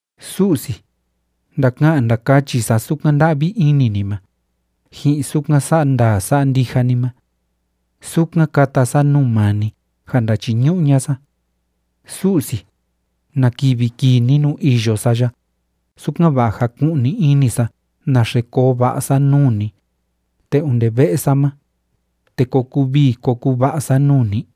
Su'si, ndaka'an ndakachi sa sukan nda'vi ini ni ma, ji'in sukan sa'a ndaa sa'a ndija ni ma. Sukan kata sa nuu maa ni ja ndachiñu'u ña'a sa. Su'si, ¿na kivi kii ni nuu iyo sa ya, sukan‑va'a jaku'ni ini sa naxe koo va'a sa nuu ni, te onde ve'e sa ma, te ko kuu vii ko kuu va'a sa nuu ni?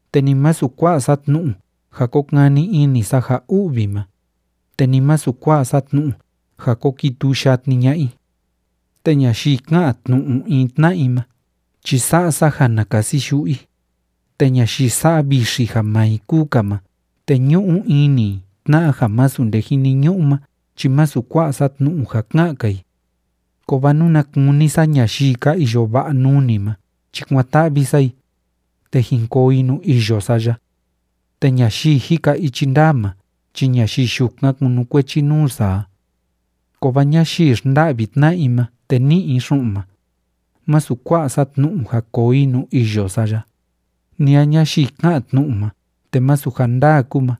Te ni masu kua'a sa tnu'u ja ko kani ini sa ja u'vi ma, te ni masu kua'a sa tnu'u ja ko kituu yatni ña'a i. Te ñayii ká'an tnu'u in tna'a i ma chi sa'a sa ja na kasi yu'u i, te ñayii sa'a vixi ja maa i kúu‑ka ma te ñu'u ini i tna'a ja masu nde jiniñu'u ma chi masu kua'a sa tnu'u ja ka'an‑ka i. Kovaa nuna kuni sa ñayii ka iyo va'a nuu ni ma chi kuan‑ta'vi sa i, te jin koo i nuu iyo sa ya. Te ñayii jika ichi ndaa ma chi ñayii yukan kunukuechi nuu sa a. Kovaa ñayii xnda'vi tna'a i ma te ní'i i xu'un ma, masu kua'a sa tnu'u ja koo i nuu iyo sa ya, ni a ñayii ká'an tnu'u ma te masu ja ndaa kúu ma,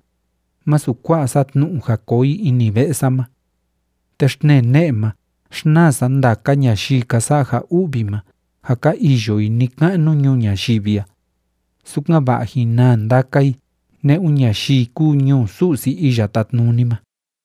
masu kua'a sa tnu'u ja koo i ini ve'e sa ma. Te xtnee ne'e ma xnaa sa ndaka ñayii ka sa'a ja u'vi ma ja ka iyo i ni‑ka'nu ñuu ñayivi a, sukan‑va'a jín naa ndaka i ne'un ñayii kúu ñuu Su'si Iya Tátnuni ma.